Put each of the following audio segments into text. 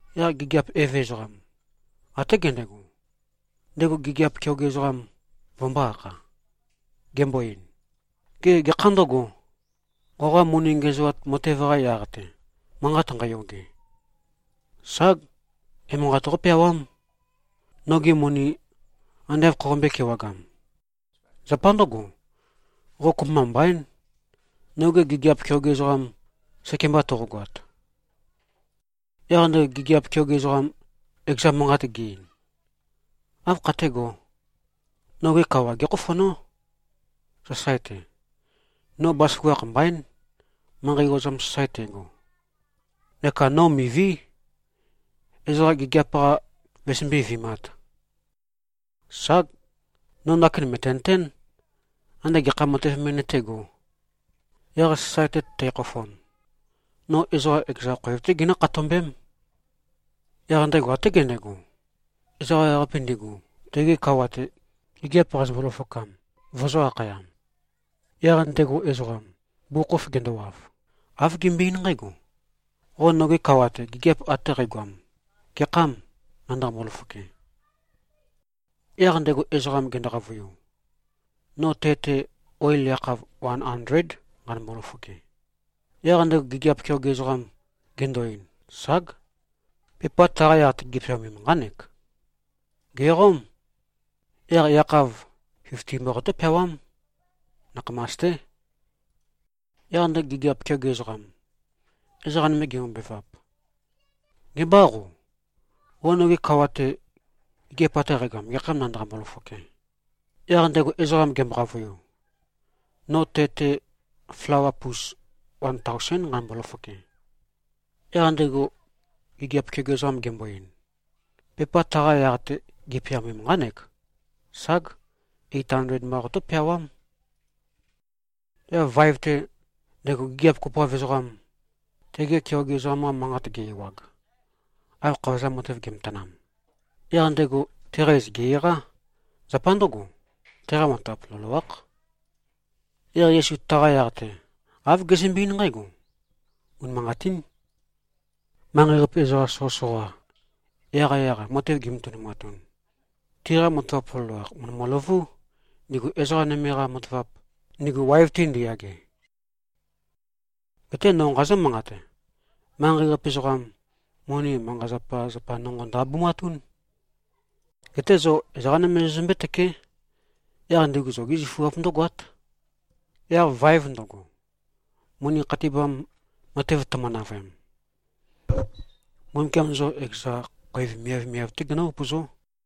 Yaq gigiap eve ezoqam, até gendego, ndego gigiap keoge ezoqam vømbō-akha, gembo-ein, ‘Gê, gekhâ ndøgo, qoqa moni ngiæzoat matev-qa yaq-te, manqat nqæyoge? Ság! Emanqat qópeawám, nogi moni ande āv khoqombøē-kewagam. Zapa ndǿgo, qo kopømba mbaín, noge gigiap keoge ezoqam, sekemba toqogoat.’ Yaq ndego gigiap keoge ezoqam, ekeza manqat ge-ein. ‘Áv khatégō? Noge kawa gékhofonó, sasae-te. No bazaføgakh mbaín, manqei ozam sasae tægo. Neka no miví, ezoqa gigiap-qa vøzømbé-vi꞉māt. Ság. No ndakin mø̀tenøtén, ande gekha matev me nøtégō. Yaq sasae-te tækhofon, no ezoqa ekeza khoev-té ginǿ-khatombém.’ Yaq ndego até gendego, ezoqa ewaqape, ndigu tege kawa-te gigiap qazømbo-løfokam, vøzø̄-akhayam. Yaq ndego ezoqam, bugukhokhof gendowav, āv gembøe-eín nqǽgo, ‘Qo noge kawa-te, gigiap ate qægoam gekhâm nandaqambo-løfoke?’ Yaq ndego ezoqam gendo-qavøiu, ‘No te-te oil yakhav wan andléd, nqanømbo-løfoke.’ Yaq ndego gigiap keoge ezoqam gendo-ein, ‘Ság. Pepa taqa yaq-te gipeaomem, nqánek. Gèqóm. Yaq yakhav fifti mba qotó-peawám. Nakhamas-té.’ Yaq ndego gigiap keoge ezoqam, ezoqa nøme gembobevap, ‘Gebâ qo. Qo noge kawa-te, gigiap ate qægoam gekhâm nandaqambo-løfoke?’ Yaq ndego ezoqam gembo-qavøiu, ‘No te-te flawa pus wan taosén, nqanømbo-løfoke.’ Yaq ndego gigiap keoge ezoqam gembo-ein, ‘Pepa taqa yaq-te gipeaomem, nqánek. Ság! Eit andled mba qotó-peawám.’ Yaq vaev-te, ndego gigiap kopoav ezoqam, tege keoge ezoqam-qa manqat ge-ewag, av khavozam matev ge꞉matanam, yaq ndego teqa iz gè-eqá. Zapa ndǿgo, teqa matavap loloákh.” Yaq Yesu taqa yaq-te, āv gezømbe-eín nqǽgo, “Unimanqatín. Manqei-qape ezoqa soqøsoqa, yaqyaq-a matev gimatønumatun, tiqa matavap loloakh mø̀ndøløvú, ndigu ezoqa nøme-qa matavap, ndigu waev-te ndiyage. Geté no nqazǿ-manqate. Manqei-qape ezoqam, moni manqa-zapazapa nonqo ndø-abumatún. Geté zo ezoqá nøme zozømbé-tøké. Yaq ndigu zogi zøfuap ndǿgoát. Yaq vaev ndøgo, moni khatibam matev tømø-navøem, Mbumbukiam zo ekeza khoev miavmiav-té genǿ-upøzó.”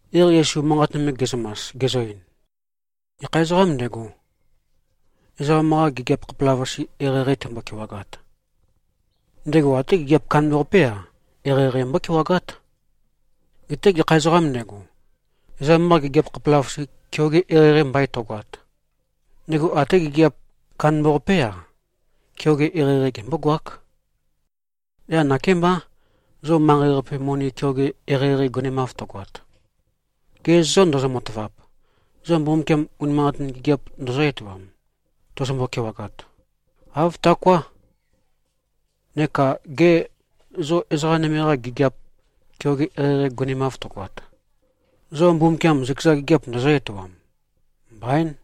Yaq Yesu manqat nøme ge꞉zømas, gezø-ein, “Gekha ezoqām ndego, ezoqam-qa gigiap khapelavøqase, eqeieqei tembo-kewagat, ndego até gigiap kandambaqapé-a, eqeieqei mbókewagát. Geté gekha ezoqām ndego, ezoqam-qa gigiap khapelavøqase, keoge eqeieqei mbain tøgoat, ndego até gigiap kandambaqapé-a, keoge eqeieqei gembógoák. Yaq nakémbá, zo manqei-qape moni keoge eqeieqei gonemav tøgoat, ge zô ndozo-matavap, zo Mbumbukiam unimanqatin gigiap ndøzǿ-etoam, tozombo-kewagat? Āv taoká. Neka gê, zo ezoqa nøme-qa gigiap keoge eqeieqei gonemav tøgoat, zo Mbumbukiam zøkeza gigiap ndøzǿ-etoam? Mbaín.”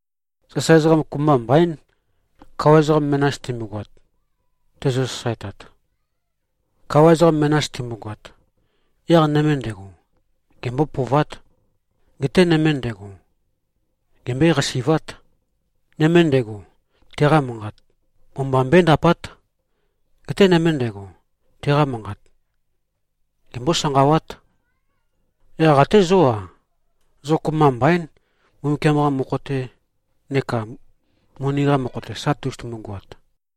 “Sasae ezoqa kopømba mbaín, kawa ezoqa menas timbogoat, tezø-sasaetat. Kawa ezoqa menas timbogoat, yaq nøme ndego, gembó-pøovát. Geté nøme ndego, gembøé-qasi꞉vát. Nøme ndego, teqa manqat o-mba mbøéndapát. Geté nøme ndego, teqa manqat gembó-sanqawát. Yaq até zó-a. Zo kopømba mbaín, Mbumbukiam-qa mokho-te neka moni-qa mokho-te sa tozotumu-goat.”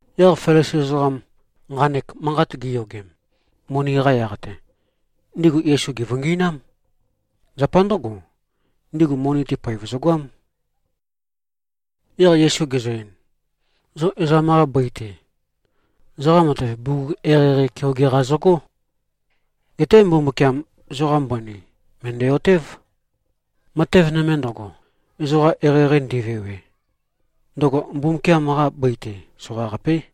Yaq Felisi ezoqam, nqanek manqat giyogem, moni-qa yaq-te, ndigu Yesu gèvøngi꞉nám. Zapa ndǿgo, ndigu moni-te poev zøgoám. Yaq Yesu gezø-ein, “Zo ezoqam-qa bøi-te, zoqa matev bugug eqeieqei keoge-qa zøgó. Geté Mbumbukiam, zoqa mbøni mø̀ndæ-otév. Matev nøme ndøgo, ezoqa eqeieqei ndivewe, ndøgo Mbumbukiam-qa bøi-te soqaqapé.”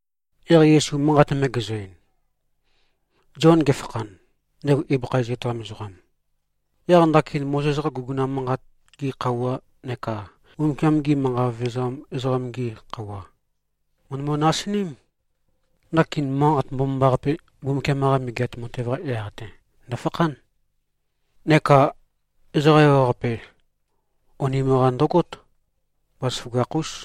Yaq Yesu manqat nøme gezø-ein, “Zion gefakhan, ndego ibøkha iz etoam ezoqam, yaq ndakin Mozes-qa guguna manqat-gi khøuwa neka Mbumbukiam-gi manqa vevezam ezoqam-gi khøuwa, mø̀ndømø-nasiním. Ndakin Manqat Mbomambaqape, Mbumbukiam-qa Megeat Matev-qa yaq-te ndøfakhán. Neka ezoqa ewaqape, onim-qa ndøgót. Bazaføgakh-ús.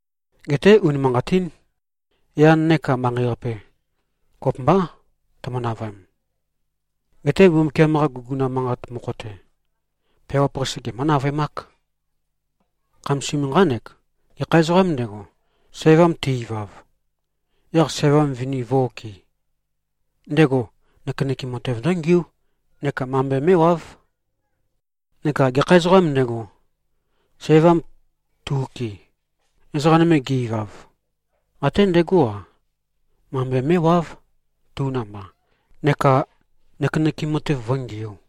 Geté unimanqatín. Yan neka manqei-qape, kopømbá, tømø-navøem. Geté Mbumbukiam-qa guguna manqat mokho-te, peawap-qase gemǿ-navøemák. Khamasim, nqánek: Gekha ezoqām ndego, sævam te-ivav, yaq sævam vini vǿ-okɨ̄, ndego nøkenøkem matev ndǿngiú neka mambe mé꞉wáv. Neka gekha ezoqām ndego, sævam tu-okɨ, ezoqa nøme ge-ivav, até ndegó-a, mambe mé꞉wáv tu namba neka nøkenøkem matev vǿngiū.”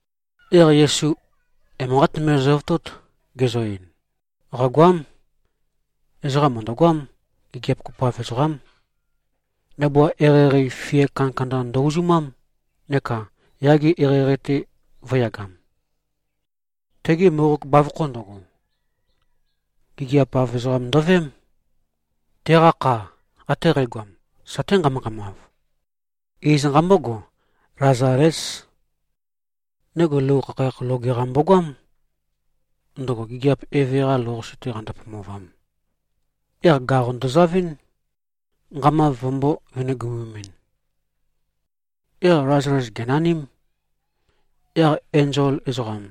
Yaq Yesu emanqát nøme zøvotót, gezø-ein, “Qàgoám. Ezoqa mø̀ndøgoám. Gigiap kopoav ezoqám. Ndabua eqeieqei fia kandakanda ndø-uzumám neka yage eqeieqei-te vø̄yagam. Tegi mboqog bavokho ndøgo, gigiap-av ezoqam ndøveém. Teqa kha ate qægoam, saté nqama-nqamav. Iz nqambógo, Lazalés. Ndego lou khakhayakh loge-qa mbogoám, ndøgo gigiap eve-qa lou-qase-te qando-pomovam. Yaq gaqo ndozavɨ́n, nqamav vømbō-venegomemɨn. Yaq Lazales gènaním. Yaq enzol ezoqam,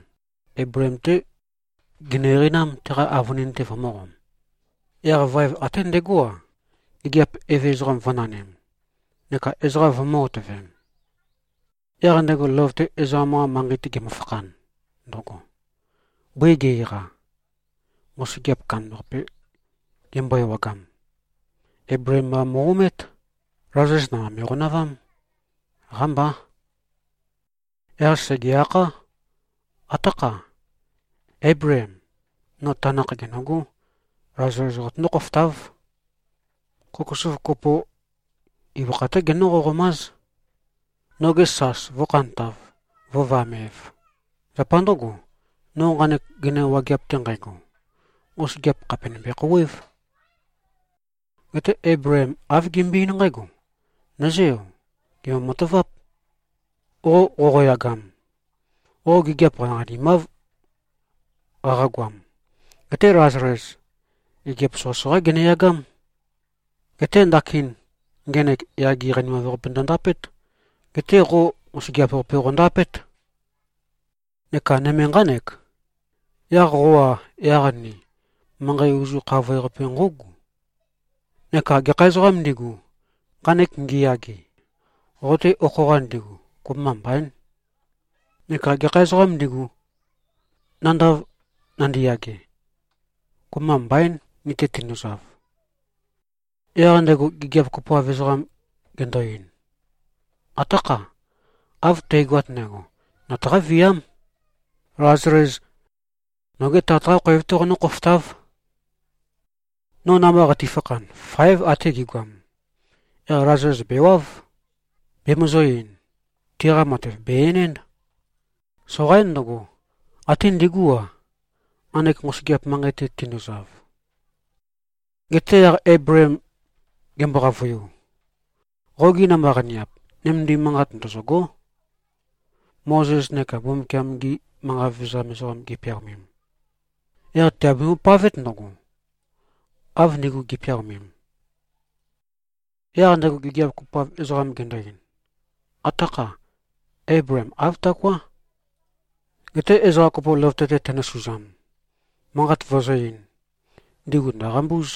Eibleem-té ginø-eqeinám, teqa avønin-te vømø̄qom. Yaq vaev até ndegó-a, gigiap eve ezoqam, vø̄nanim, neka ezoqa vømø̄-otøvem. Yaq ndego løvøte ezoqam-qa manqei-te gemøfakhan ndøgo, bøi ge-eqa, nqosøgeap kandambaqape gembo-ewagam, Eibleem mba mo꞉-omét. Lazales namba me꞉qonavám. Qámbá. Yaq sège-akhá, ‘Atákha. Éibleem. No tanakh gènøgó. Lazales qotøndó-khofotáv. Kokosov kopo ibøkha-té genǿ-qoqomáz, noge sas vǿkhantāv, vǿvamēv. Zapa ndǿgo, no nqanek gøina wageap-te nqægo, nqosøgeap khàpe nømbe-khouwév.’ Geté Eibleem āv gembøe-eín nqǽgo, ‘Nǿzeø. Gèmbo-mataváp. Qo qoqoyagam, qo gigiap qaniqanimáv qaqagoam. Geté Lazales gigiap soqøsoqá geneyagám. Geté ndakin ngenek yage qanimav-qape ndøndapét. Geté qo nqosøgeap-qape qondapét. Neka nøme nqánek: Yaq qo-a, yaq ni, manqei ozu khavoe-qape nqǿugu. Neka gekha ezoqām ndigu, nqanek ngiyage, qo-te okho-qa ndigu, kopømba mbaín. Neka gekha ezoqām ndigu, nandav nandiyage, kopømba mbaín, ni-te tinduzav.’ Yaq ndego gigiap kopoav ezoqam gendo-ein, ‘Atákha. Av tægoat ndægo. Nøtaqá-viám. Lazales nogé tat-qá khoev-té qonǿ-khofotáv. No namba qatifakhan, fáev ate gi꞉goam. Yaq Lazales bèwáv, bemøzø̄-ein, tiqa matev bè-enénd. Soqaín ndøgo, até ndigú-a, nqanek nqosøgeap manqei-te tinduzav.’ Geté yaq Eibleem gembo-qavøiu, ‘Qogi namba-qaniap, nømendim manqat ndøzø̂gó, Mozes neka Mbumbukiam-gi manqa vevezam ezoqam gipeaomem. Yaq tìabembo-pavét ndøgo, av ndigu gi꞉peaomem.’ Yaq ndego gigiap kopoav ezoqam gendo-ein, ‘Atákha. Éibleem. Āv taoká. Geté ezoqa kopo løvøte-te tendosuzam, manqat vøzǿ-eīn, ndigu ndø̀qambúz.’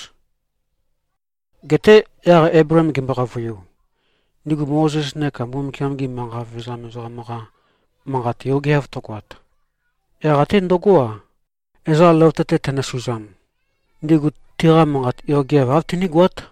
Geté yaq Eibleem gembo-qavøiu, ‘Ndigu Mozes neka Mbumbukiam-gi manqa vevezam ezoqam-qa manqat yogeav tøgoat, yaq até ndøgó-a, ezoqa løvøte-te tendosuzam, ndigu teqa manqat yogeav āv tinígoát.’”